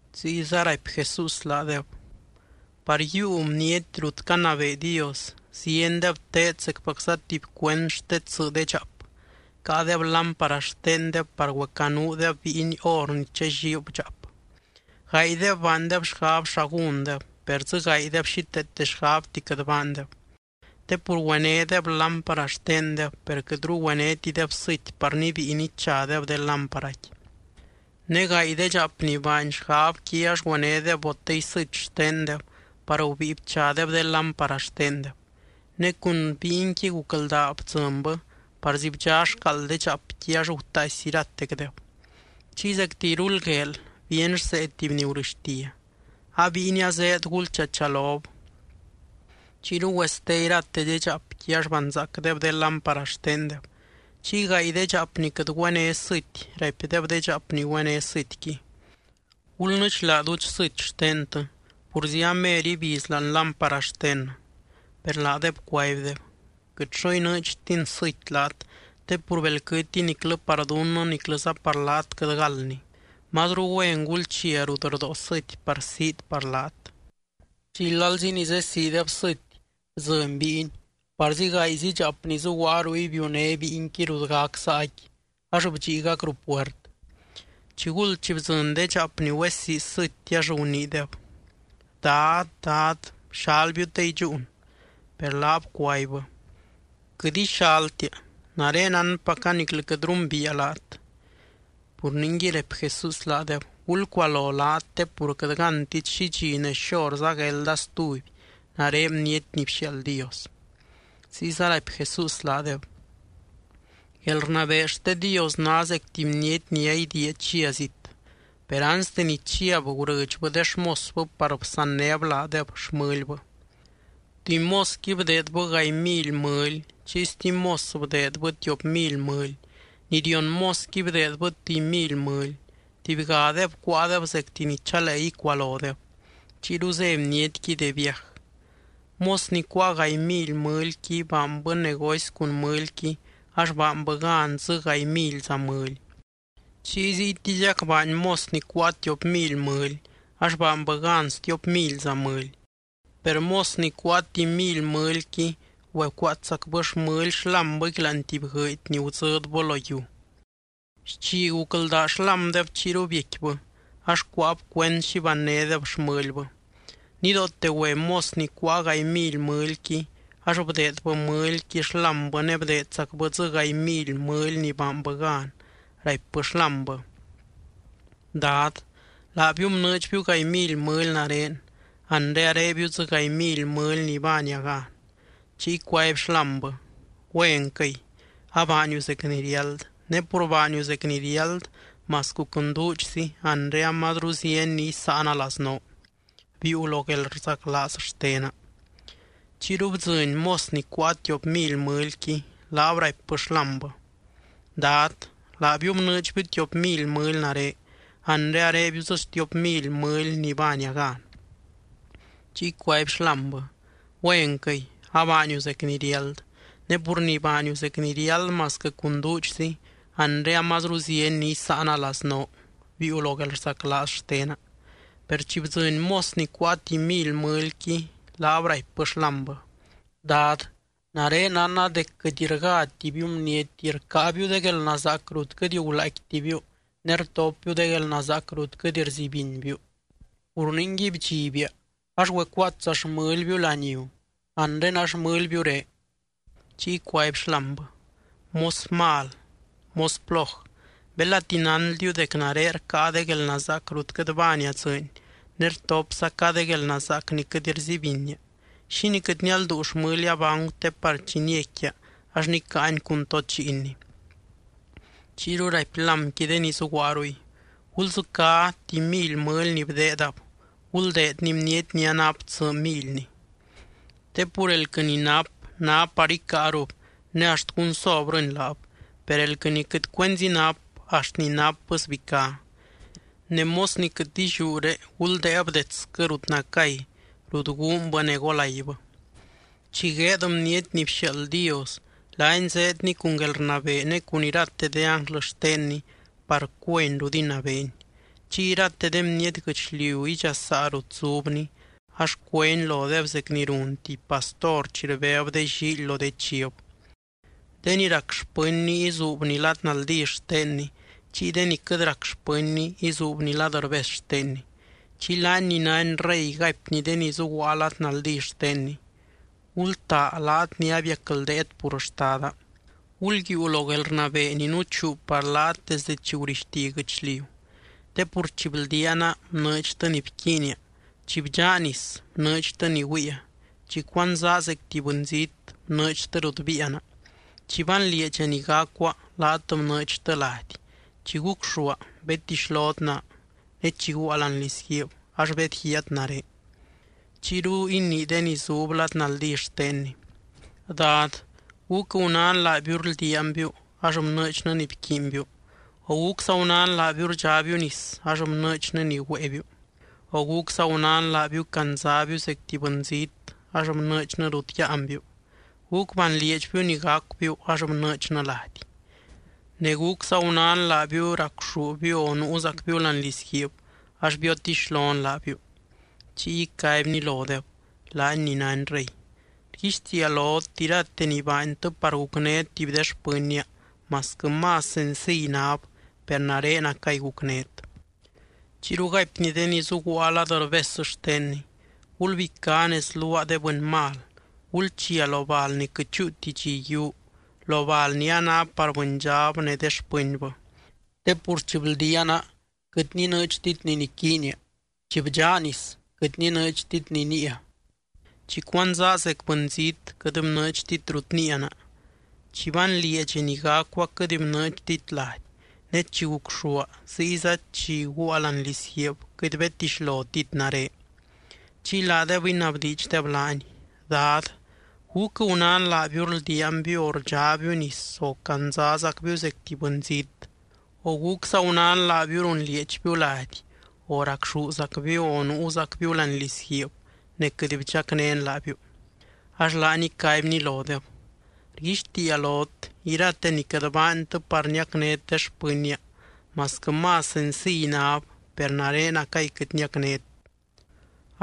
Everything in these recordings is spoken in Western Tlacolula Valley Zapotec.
Ziyza raipy Jesús laadeb: —Par yiiu bniety rut canabee Dios ziendeb teed zecpacza tuby cuend xte tsɨ de dxaap, caadeb lámpara xtendeb par güecanuudeb bíiny hor ni challiib dxaap. Gaaydeb baandeb xgab xa gúndeb, per dzɨ gaaydeb xíteete xgabti quɨt baandeb. Te pur güenédeb lámpara xtendeb, per quɨtru güenétideb sɨty par nibíi nichadeb de lámparaqui. Ne gaay de dxaap ni baany xgabqui ax güenédeb botey sɨty xtendeb par gubíi bchadeb de lámpara xtendeb. Ne cun bíinqui gucldaa bdzɨnbɨ, parzi bdxá xcaald de dxaapqui ax gutaaisy iratecdeb. Chiy zecti iruld gueel bíeny rsee tuby ni gurɨxtia: “¡A bíiny azéed, gulchachalob!” Chiyru güeste irate de dxaapqui, ax banzaacdeb de lámpara xtendeb. Chiy gaay de dxaap ni quɨt güené sɨty raipdeb de dxaap ni güené sɨtyqui: “Gulnɨdxlaa duudx sɨty xtentɨ purzi amer ibiz láani lámpara xtennɨ.” Per laadeb cuaibdeb: “Quɨt xo inɨɨdxtin sɨty laat, te pur belquɨtiy niclɨ par dunnɨ niclɨza par laat quɨt galdni. Mazru güen gulchia rut rdóo sɨty par siit par laat.” Chiy lalzi ni zesiideb sɨty, bdzɨny bíiny, parzi gaayzi dxaap ni zuguaa ruy biuné bíinqui rut gac saaqui ax bdxiigac ruu puert. Chiguld chi bdzɨny de dxaap ni güesii sɨty, ax guniideb: “¡Dad, Dad, bxalbiu te idxúun!” Per laab cuaibbɨ: “Quɨt ixaltia. Nare nánpaca niclɨ quɨt rumbiia laat.” ’Pur ningui —raipy Jesús laadeb— gulcualo laat te pur quɨt gántit xi dxi ne xorza guelda stuby nare Bniety ni bxiaald Dios. Ziyza raipy Jesús laadeb: —Guelrnabee xte Dios ná zec tuby bniety ni aidiia chia zit, per anste ni chiab gurɨdxbɨ de xmosbɨ par bsannéb laadeb xmɨlbɨ. ’Tuby mosqui bdeedbɨ gaay mily mɨly, chiy stuby mos bdeedbɨ tiop mily mɨly, ni rion mosqui bdeedbɨ tuby mily mɨly. Tubygadeb cuáadeb zecti ni chalee icualodeb. Chiyru zé bnietqui de viaj. Mos ni cuáa gaay mily mɨlyqui, baanbɨ negocy cun mɨlyqui ax baanbɨ gan dzɨ gaay milyza mɨly. Chiy ziytiziac baany mos ni cuáa tiop mily mɨly, ax baanbɨ gan stiop milyza mɨly. Per mos ni cuáa tuby mily mɨlyqui, güecuaatsacbɨ xmɨly xlámbɨqui láani tuby guɨɨdy ni gudzɨdbɨ lo yiu. ’Xchi gucldaa xlámdeb chiyru biecquibɨ, ax cuáab cuend xi bannédeb xmɨlbɨ. Nidoote güe mos ni cuáa gaay mily mɨlyqui, ax bdeedbɨ mɨlyqui xlámbɨ ne bdeedzacbɨ dzɨ gaay mily mɨly ni baanbɨ gan, raipbɨ xlámbɨ: “Dad, laabiu bnɨɨdxbiu gaay mily mɨly nare, anre arebiu dzɨ gaay mily mɨly ni baania gan.” Chiy cuaby xlámbɨ: “Güenquɨy, abaaniu zec ni riáld. Ne pur baaniu zec ni riáld masquɨ cun duudxzi, anre amazru zieny ni isáana laznoo. Biiu lo guelrzaclaaz xtena.” Chiyru bdzɨny mos ni cuáa tiop mily mɨlyqui, laab raipbɨ xlámbɨ: “Dad, laabiu bnɨɨdxbiu tiop mily mɨly nare, anre arebiu dzɨ stiop mily mɨly ni baania gan.” Chiy cuaby xlámbɨ: “Güenquɨy, abaaniu zec ni riáld. Ne pur ni baaniu zec ni riáld masquɨ cun duudxzi, anre amazru zieny ni isáana laznoo. Biiu lo guelrzaclaaz xtena.” Per chi bdzɨny mos ni cuáa tuby mily mɨlyqui, laab raipbɨ xlámbɨ: “Dad, nare nánna dec quɨt rgátibiu bniety, rcáabiu de guelnazaac rut quɨt gulaaicquitibiu ne rtopbiu de guelnazaac rut quɨt rzibinbiu. Pur ningui bdxibia, ax güecuaatsa xmɨlbiu laniu. Anre a xmɨlbiuré.” Chiy cuaby xlámbɨ: “Mos mal, mos ploj. Belati nánldiu dec nare rcáa de guelnazaac rut quɨt baania dzɨɨny ne rtopzaca de guelnazaac ni quɨt rzibinia, ¿xínii quɨt nialduu xmɨlia bancu te par chi niecquia ax nicáani cun tod lliinni?” Chiyru raipy lámqui de ni zuguaa ruy: “Guldzɨcá tuby mily mɨly ni bdeedab, guldeedni bniety ni anap tsɨ milyni. Te pur elquɨ ni nap, ná par icáarub ne axt gunsobrɨni laab. Per elquɨ ni quɨt cuenzi nap, axt ni napbɨ sbicá. Ne mos ni quɨt illiúre, guldéeb detsquɨ rut nacay, rut guunbɨ ne golaibɨ.” ’Chi gueed Bniety ni bxiaald Dios, laany zeedny cun guelrnabee ne cun irate de ánglɨ xtenny par cueny rut inabeeny. Chiy irate de bniety guɨchliu idxasaa rut zubny, ax cuény lodeb zec ni run tuby pastor chi rbéb de llíily lo de chiv. De ni rac xpɨnny izuubny lad naldí xtenny, chiy de ni quɨt rac xpɨnny izuubny lad rbes xtenny. Chiy laany ni nány Rey gaipny de ni zuguaa lad naldí xtenny: “Gultaa laat ni abiacldeet pur Xtada. Gulyiiu lo guelrnabee ni nuchuu par laat desde chi gurixti guɨchliu. Te pur chi bldiaana, bnɨɨdxtɨ ni bquiinia, chi bdxaa nis, bnɨɨdxtɨ ni güiia, chi cuandzaa zec tuby bɨnzít, bnɨɨdxtɨ rut biiana. Chi banlieedxa ni gacua, laat bnɨɨdxtɨ lady, chi gucxúa, bedtixlot naa, ne chi guaa láani lizguiib ax bedguiaat nare.” Chiyru inii de ni zub lad naldí xtenny: “Dad, ¿gúc gunán laabiu rldiaanbiu, ax bnɨɨdxnɨ ni bquiinbiu? ¿O gúcza gunán laabiu rdxábiu nis, ax bnɨɨdxnɨ ni güéebiu? ¿O gúcza gunán laabiu candzabiu zec tuby bɨnzít, ax bnɨɨdxnɨ rut yáanbiu, gúc banlieedxbiu ni gacubiu, ax bnɨɨdxnɨ lady? Ne, ¿gúcza gunán laabiu racxúbiu o nuuzacbiu láani lizguiib, ax biotixlon laabiu?” Chiy icaibny lodeb, laany ni nány Rey: “Rguixtiia lot, irate ni baantɨ par gucnét tuby de xpɨnnia, masquɨ más senciy náb, per narenacay gucnét.” ’Chiyru gaipny de ni zuguaa lad rbes xtenny: “Gulbicá nez luaa de bɨny mal, gulchia lo bal ni quɨt chúuti dxi yiuu, lo bal ni a ná par bɨndxab ne de xpɨnbɨ. Te pur chi bldiaana, quɨt ninɨɨdxtit ni niquiinia, chi bdxaa nis, quɨt ninɨɨdxtit ni níia. Chi cuandzaa zec bɨnzít, quɨt bnɨɨdxtit rut níiana, chi banlieedxa ni gacua, quɨt bnɨɨdxtit lady. Ne chi gucxúa ziyza chi guua láani lizguiib, quɨt bedtixlotit nare.” Chiy laadeb inabdiidxdeb laany: “Dad, ¿gúc gunán laabiu rldiaanbiu, o rdxábiu nis, o candzazacbiu zec tuby bɨnzít, o gúcza gunán laabiu runlieedxbiu lady, o racxúzacbiu, o nuuzacbiu láani lizguiib ne quɨt bdxacnén laabiu?” Ax laany icaibny lodeb: “Rguixtiia lot, irate ni quɨt baantɨ par niacnét de xpɨnnia, masquɨ más senciy náb, per narenacay quɨt niacnét.”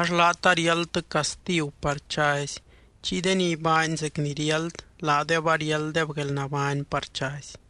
Ax laat ariáldtɨ castigu par chazy, chiy de ni baany zec ni riáld, laadeb ariálddeb guelnabány par chazy.